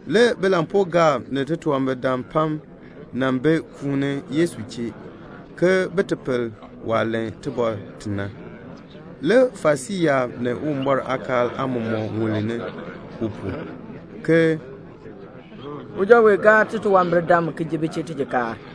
Le bilampuugaab ni titunwambirdam pam nan bi peeni Yesu chee, ke bin ti pel waah len tibɔr ti na. Le Farisii yaab ni Uwumbɔr aakaal aamɔmɔkb ŋulni u pu, ke "Uja wee gaar titunwambirdam ki ji bi chee tijikaar."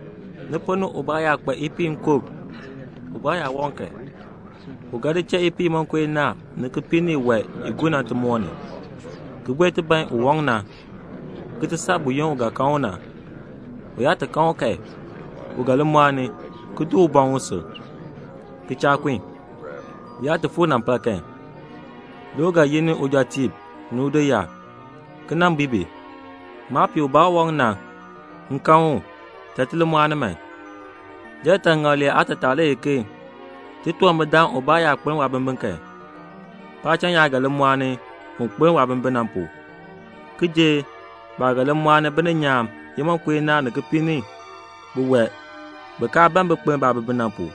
"Ni ponn ni ubaa yaa kpa ipiih nkub, ubaa yaa waŋ kan, u ga di cha ipiih imonko inaa ni kipiik ni iwae i gur na timoor ni, ki buen ti ban un waŋ na, ki ti saa buyoonn u ga kan u na. U yaa ti kan u kan, u ga li mɔɔni, ki di buŋ usil, ki cha kun. U yaa ti fuu linampal kan, le u ga yi ni ujɔtiib ni udoyaab, ki nan bui bi, 'Maapiih ubaa u waŋ na, m kan u. Cha ti li mɔɔni man.' Liyaataŋakl lee aatataa le ye ke titunwambirdaan ubaa yaa kpeln waabimbin kan, paacham yaab ga li mɔɔni un kpeln waabimbin na pu, ki jer baah ga li mɔɔni bininyaan imonko inaa ni kipiik ni biwae bi kaa ban bin kpeln baabimbin na pu."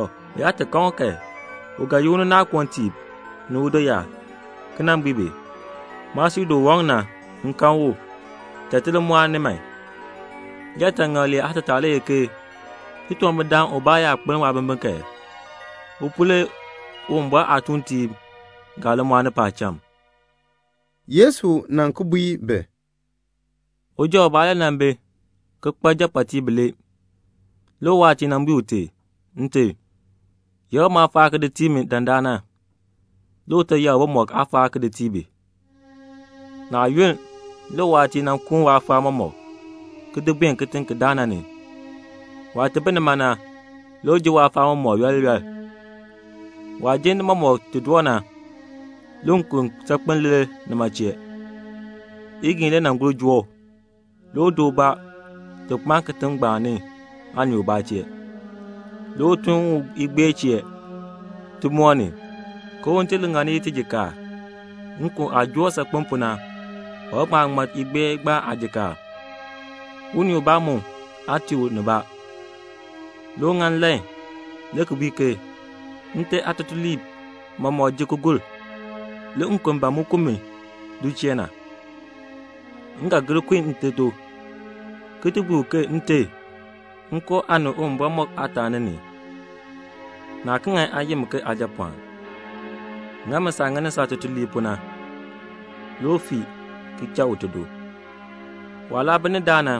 Tɔ, u yaa ti kan ni kan, u ga yi ni unaakoontiib ni udoyaab, ki nan bui bi, 'Maasili u waŋ na, m kan u. Cha ti li mɔɔni man.' Liyaataŋakl lee aatataa le ye ke titunwambirdaan ubaa yaa kpeln waabimbin kan, u pu le Uwumbɔr aatuuntiib ga li mɔɔni paacham." Le Yesu ki bui bi, "Uja ubaa le nan bi ki kpa japɔɔtiib bilee. Le uwaatiir na bui ute, 'Nte, yakr maafaal ki di tii mi dandana.' Le ute yakr bimɔk aafaal ki di tii bi. Naa yunn, le uwaatiir na kuun waafaal mɔmɔk, ki di buen kitiŋ ki daa na ni. Waah bi nima na, le u ji waafaal mɔmɔk yooli yooli. Waah jin ni mɔmɔk doo na, le nkon saakpem lir nima chee. Igiin le gur joo u. Le u di ubaa ti kpaan kitiŋ ngbaan ni aanii ubaa chee. Le u tun u igbeer chee timoor ni ke un ti ŋa i tijikaar. Nkon aah joo u saakpen pu na, u ga ŋma ŋman igbeer ngbaan aajikaar. Unii ubaa aa tii u. Le u ŋa nlan le ki bui ke 'Nte aatutuliib mɔmɔk ji ki gur. Le nkon ban mu ku mi du chee na. M ga gir kun nte do, ki ga bui u, Nte, m koo aa ni Uwumbɔr mɔk aataani la. Naa ki ŋan aa yi mi aajapɔɔn. Ŋa mi saah ŋani saatutuliib pu na.' Le u fii ki cha ute do. "Waah laa bi ni daa na,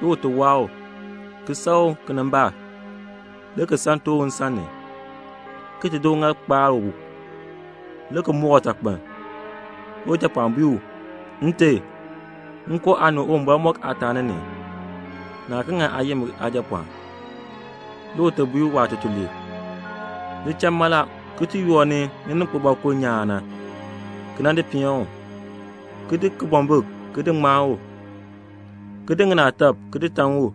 le ute waa u, ki san u kinimbaak, le ki san tooh u nsan ni, ki di uŋaal kpar u, le ki moor utakpiln. Le ujapɔɔn bui u, 'Nte, m koo aa ni Uwumbɔr mɔk aataani. Naa ki ŋan aa yi mi aajapɔɔn.' Le ute bui waatutuliib, 'Li cha mala ki ti yoor ni lininkpibɔkuln nyaan na, ki di peen u, ki di kibɔmbik ki di ŋmaan u, ki di ŋinaatak ki di taŋ u,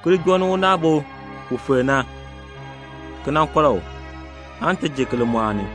ki li joo ni unaabo u filk na, ki kɔr u, aan ti ji ki li mɔɔni.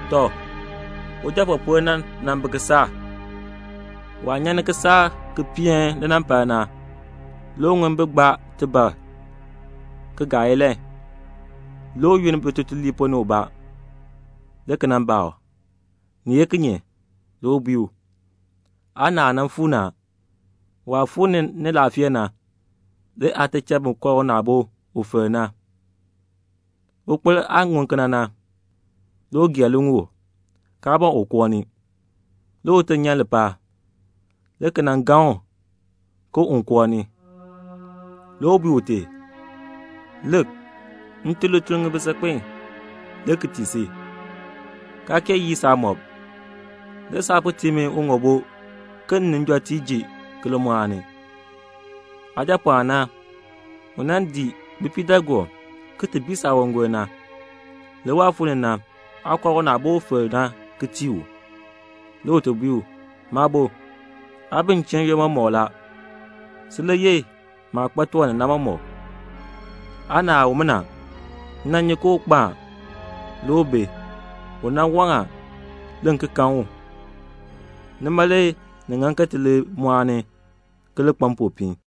"Tɔ, ujapɔɔpol na nan bi kisaak la. Waah nyan ni kisaak ki peeni linampal na, le u ŋun bi gbaa tibar ki gaa ilahn. Le u yin bitutuliib ponn ni ubaa, le ki nan baa u, 'Ni ye kinye?' Le u bui u, 'Aanaal na fuu ni a. Waah fuu ni ni laafee na, le aate cha bin kɔr unaabo u filk na.' Ukpil aah ŋun kena na, le u gee liŋuul, kaa ban un koo ni. Le ute nyan ni lichiln ni, le ki nan gaŋ u ke un koo ni. Le u bui ute, 'Lik, m tun lituln ŋibin saakpen ki tii si, kaa kee yii saamɔb. Le saa po tii mi uŋoobo m ni njɔtiib ji ki li mɔɔni. Aajapɔɔn na, u nan dii bipiidaagoob ki ti bii saawangol na, le waah fuu ni na, aa kɔr unaabo u filk na ki tii u.' Le ute bui u, 'Maabo, aa bi m chee n-yoonn mɔmɔk la. Sin le yeh maah kpa tiwan ni na mɔmɔk. Aanaal umina, m nyi ke u kpo a, le u bi. U nan waŋ a, le m ki kan u. Nima le ni ŋan ke ti li mɔɔni ki li kpa mpopiin."'